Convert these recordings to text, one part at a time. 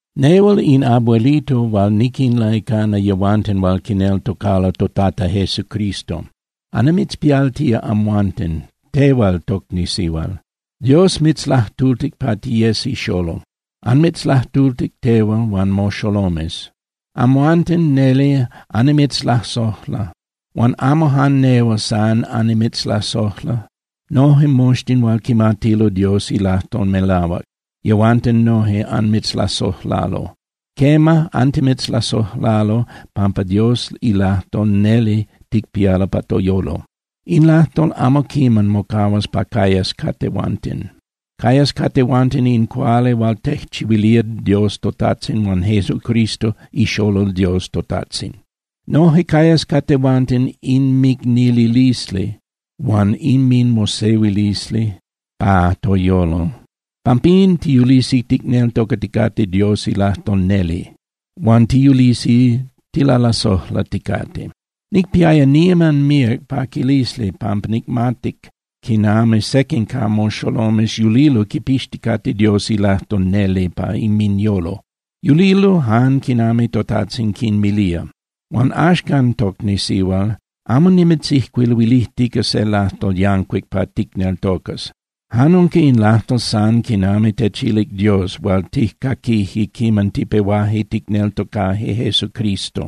Nehual in abuelito hual niquinlaicana yehuanten hual quineltocalo toTata Jesucristo. Annimitzpialtía amhuanten, tehual, tocni sihual. Dios mitzlajtultic pa tiyes ixolol. Anmitzlajtultic tehual huan moxolomes. Amhuanten neli annimitzlasojla. Huan amo jan nehual san annimitzlasojla. Noje moxtin hual quimatilo Dios ilajtol melahuac, yehuanten noje anmitzlasojlalo. Quema, antimitzlasojlalo pampa Dios ilajtol neli ticpialo pa toyolo. In lajtol amo quiman mocahuas pa cayas ca tehuanten. Cayas ca tehuanten in cuali hual tejchihuilía Dios toTajtzin huan Jesucristo iXolol Dios toTajtzin. Noje cayas ca tehuanten inmicnililisli huan inminmosehuilisli pa toyolo. Pampín, tiyulisi ticneltocaticate Dios ilajtol neli, huan tiyulisi tilalasojlaticate. Nicpiaya niman míac paquilisli pampa nicmatic quinami sequin ca moxolomes yulilo quipixticate Dios ilajtol neli pa inminyolo. Yulilo jan quinami toTajtzin quinmilía. Huan axcan, tocni sihual, amo nimitzijcuiluilijtica se lajtol yancuic pa ticneltocas. Jan unca in lajtol san quinami techilic Dios hual tijcaquije quiman tipehuaje ticneltocaje Jesucristo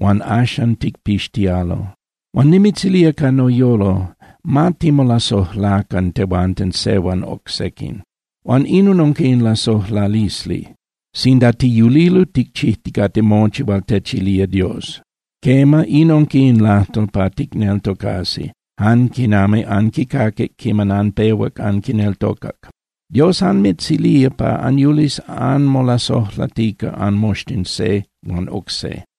huan axan ticpixtialo. Huan nimitzilía ca noyolo, ma timolasojlacan tehuanten se huan oc sequin. Huan inon unca in lasojlalisli, sinda tiyulilo ticchijticate mochi hual techilía Dios. Quema, in unca in lajtol pa ticneltocasi, jan quinami anquicaquic quiman anpehuac anquineltocac: Dios anmitzilía pa anyulis anmolasojlatica anmoxtin se huan oc se.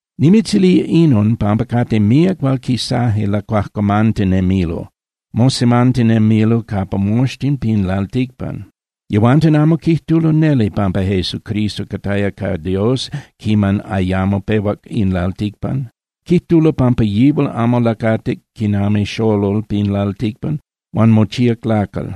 Nimitzilía inon pampa cate míac hual quisaje lacuajcuamantinemilo, mosemantinemilo capa moxtin pin lalticpan. Yehuanten amo quijtulo neli pampa Jesucristo cataya ca Dios quiman ayamo pehuac in lalticpan, quijtulo pampa yihual amo lacatic quinami xolol pin lalticpan huan mochíac lacal.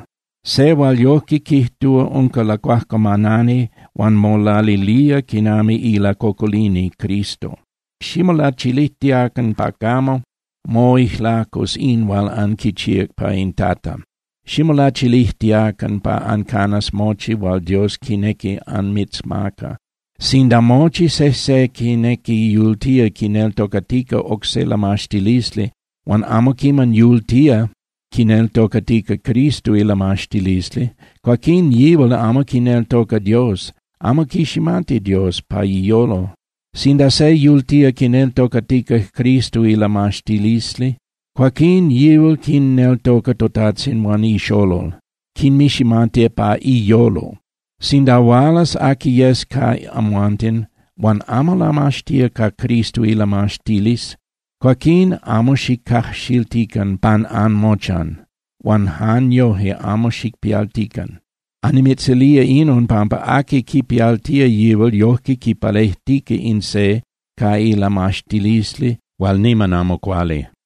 Se hual yojque quijtúa unca lacuajcuamanani huan molalilía quinami ilacocolini Cristo. Ximolachilijtiacan pa camo moijlacus in hual anquichíac pa in Tata. Ximolachilijtiacan pa ancanas mochi hual Dios quinequi anmitzmaca. Sinda mochi sejse quinequi yultía quineltocatica oc se lamaxtilisli huan amo quinequi yultía quineltocatica Cristo ilamaxtilisli, cuaquín yihual amo quineltoca Dios, amo quiximati Dios pa iyolo. Sinda se yultía quineltocatica Cristo ilamaxtilisli, cuaquín yihual quinneltoca toTajtzin huan iXolol, quinmiximati pa iyolo. Sinda hualas aqui yes ca amhuanten huan amo lamaxtía ca Cristo ilamaxtilisli, cuaquín amo xicajxiltican pan anmochan, huan jan yoje amo xicpialtican. Annimitzilía inon pampa aqui quipialtía yihual yojque quipalejtica in se ca ilamaxtilisli hual niman amo cuali.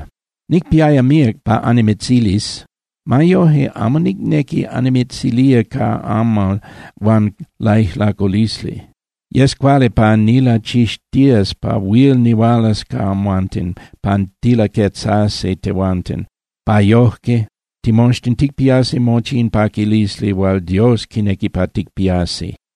Nicpiaya míac pa annimitzilis. Ma yoje, amo nicnequi annimitzilía ca amal huan lajcuilulisli. Yes cuali pa nilachixtías pa huil nihualas ca amhuanten pa tilaquetzasi tehuanten, pa yojque timoxtin ticpiasi mochi in paquilisli hual Dios quinequi pa ticpiasi.